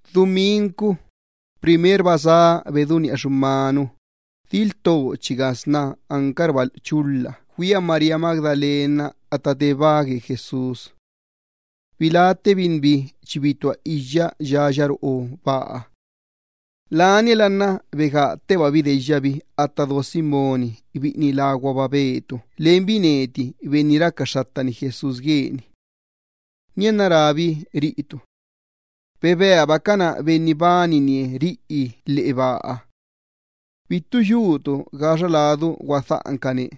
Dumincu, primerba sá redú lo xumanu, diltochiga sna ancarla chulha güia María Magdalena atta te baa gue Jesús. Biláttebinbi chi bitúa iyya yaya roꞌo baaha. Laniala nna begáttebabi deyyabi atta do Simón biꞌini láguaba Pedro lenbi biꞌini racaxxattani Jesús guebiha. Nianna, rábi ca biꞌiniha: —¡Bebeabacana Benni bananie ri lheꞌe baaha! ¡Bittu yutu gaxa ladu guadhaꞌancane!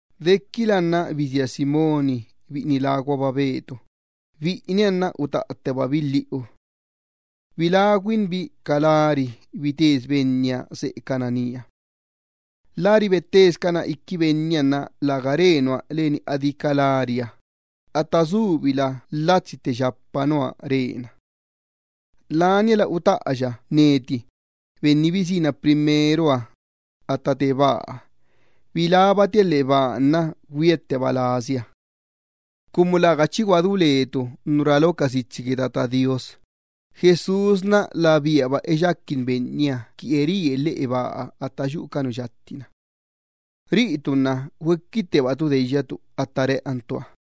Dequila nna bisía Simón biꞌini láguaba Pedro. Biꞌiniha nna utaꞌattebabi lhiꞌu. Labi nna biláguabinbi ca lari bitesi Benniha seꞌecana nía. Lari bottesicana iqui Benniha nna läga re nua leni adí ca lariha, atta subila latsi tte yapa nua rena. Laniala utaꞌa biꞌini bisína primero atta te baaha. Bilábinbi lheꞌe baaha nna güiatteba lebi. Cumu läga chi guadú lecabi gue nu chi gaꞌana lo ca sitsi gue Tata Do Iyyabaaha, atta rá Jesús labíaba eyaquin Benniha qui eríe lheꞌe baa atta yuꞌu ca nu yatti-na. Lacabi nna güequittebacabi deyyacabi atta reꞌancabiha.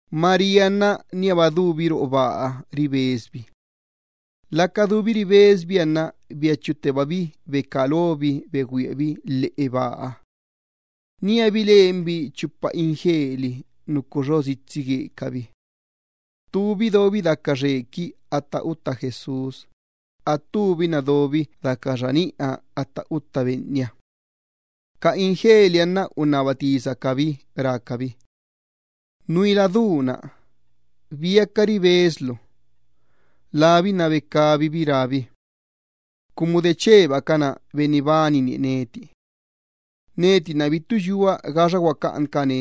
María nna níaba dubi roꞌo baaha ribesbi. Laca dubi ribesbiha nna biachuttebabi becá lobi begüiabi lheꞌe baaha. Nía bilenbi chupa ingeli nucu xo sitsi guecabi. Ttubi dobi daca xequi atta utta Jesús, attubi nna dobi daca xaniꞌa atta utta Benniha. Ca ingeliha nna unnaba tisacabi rácabi: —Xa nuila du-na, ¿biaca ribeslu? Labi nna becabibi rábi: —Cumu dechebacana Benni bananie neti. Neti nna bittu yua gaxa guacaꞌancane.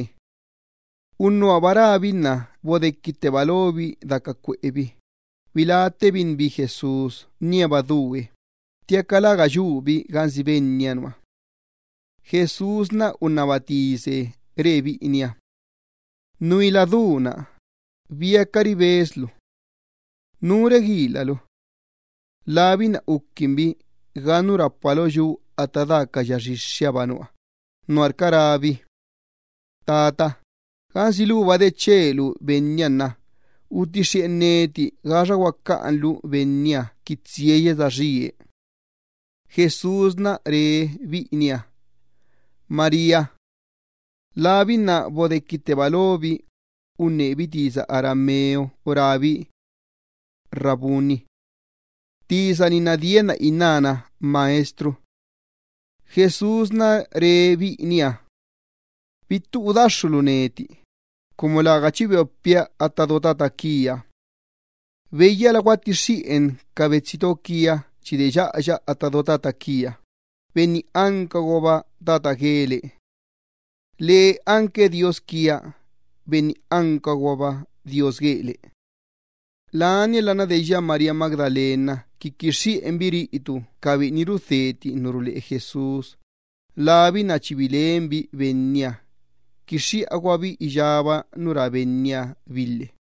Unnuhaba rábi nna bodequitteba lobi daca cuꞌebi, biláttebinbi Jesús níaba due, ttiaca läga yubi gansi Benniha nua. Jesús unnaba tise re biꞌiniha: —Nuila, ¿biaca ribeslu? ¿Nú reguilalu? Labi nna uquinbi ga nu rapa lo yu atta daa ca ya xixxihaba nua, nuarca rábi: —Xa Tata, gansi luba dechelu Benniha nna utixxiꞌen neti gaxa guacaꞌanlu Benniha qui tsiaya saxíe. Jesús re biꞌiniha: —¡María! Labi nna bodequitteba lobi, unnebi tisa arameo rábi: —¡Raboni! —Tisa-ni nna dienna innána Maestro. Jesús re biꞌiniha: —Bittu udaxxulu neti, cumu läga chi beopia atta do Tata quia. Beyyala guattixxiꞌen ca betsito quia chi deyyaꞌaya atta do Tata quia, Benni ancaguaba Tata guele. Lee anque Dios quia, Benni ancaguaba Dios guele. Laniala nna deyya María Magdalena qui quixxiꞌenbi ca biꞌini rudheti ca tisa ruleꞌe Jesús, labi nna chi bilenbi Benniha, quixxiꞌaguabi iyába nu rá Benniha bi lhe.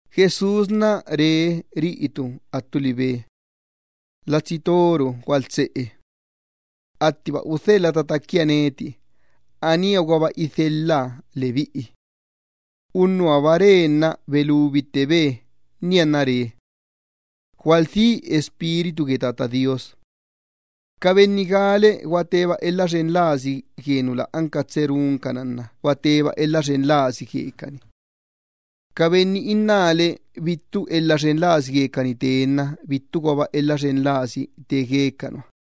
Jesús re ca biꞌiniha attu libe: —¡Xen su lee gualtseꞌe! Attiba udhelha Tata quia neti, aníaguaba idhelha lebiꞌi. Unnuhaba re nna belubittebe, nianna re: —Gualdhí Espíritu gue Tata Do Iyyabaaha. Ca benni gále gua teba elha xen lasi gue nu lä anca tsee runcana nna gua teba elha xen lasi guecani. Ca benni innále bittu elha xen lasi guecani te nna bittuguaba elha xen lasi te gue ca nua.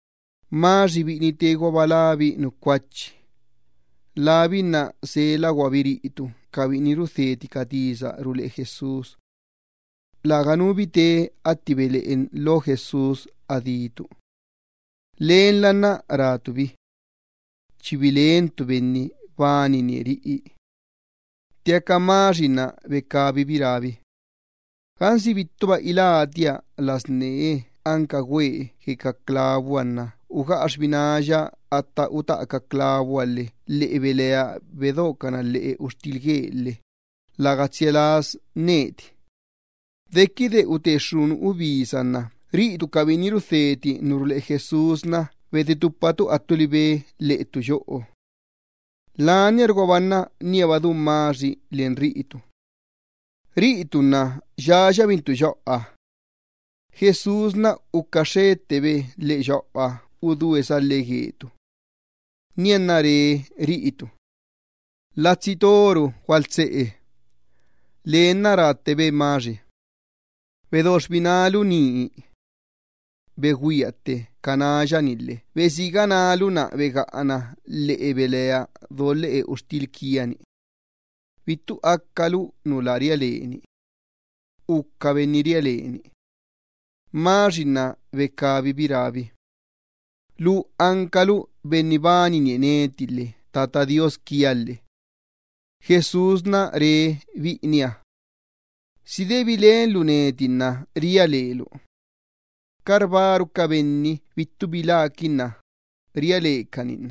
Tomás biꞌini teeguaba lábi nu Cuachi, labi nna selaguabi ca biꞌini rudheti ca tisa ruleꞌe Jesús. Läganu bi te atti beleꞌen lo Jesús adí ca biꞌiniha. Lenla nna rácabi biꞌiniha: —Chi bilentu Benni bananie riꞌi. Ttiaca Tomás nna becabibi rábi: —Gansi bittuba ilátia las nee anca güee gue ca clavuha lhe ugaꞌa xbináya atta utaꞌa ca clavuha lhe lheꞌe belea bedocana lheꞌe uxtil guee lhe läga tsia las neti. Dequide ute xxunu ubisa nna ca biꞌini rudheti ca tisa ruleꞌe Jesús bedetupattebacabi attu libe lheꞌe ttu yoꞌo. Laniarguaba nna níaba du Tomás len ca biꞌiniha. Riꞌitu nna yayabintu yoꞌoha. Jesús ucaxxettebe lheꞌe yoꞌoha udúe salhe guetu. Nianna re riꞌitu: —¡Xen su lee gualtseꞌe! Lee nna ráttebe Tomás: —Bedo xbinálu nii. Begüiatte ca náya-ni lhe besiga nálu nna begaꞌa nálu lheꞌe belea do lheꞌe uxtil quia-ni. Bittu acalu nu lä ria leni. Uca benni ria leni. Tomás nna becabibi rábi: —¡Lu ancalu Benni bananie neti lhe Tata Do Iyyabaaha quia lhe! Jesús re biꞌiniha: —¿Si de bilenlu neti nna ria lelu? ¡Carbáru ca benni bittu biláquinna nianna ria lecani!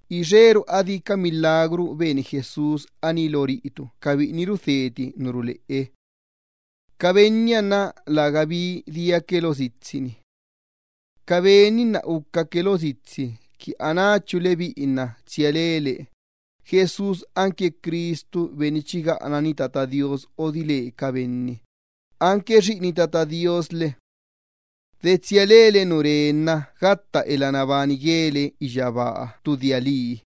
Ixeru adí ca milagru beni Jesús aní lo ca biꞌini rudheti ca tisa ruleꞌe. Ca benniha nna lägabi diaque lo sitsi-ni. Ca ben-ni nna ucaque lo sitsi qui anáchu lebiꞌi nna tsia lele Jesús anque Cristu Benni chi gaꞌanani Tata Do Iyyabaaha odile ca benni, anque Xiꞌini Tata Do Iyyabaaha lhe. De tsia lele gue Ben-na nna gatta elha nabani guele iyyabaaha ttu dia lii.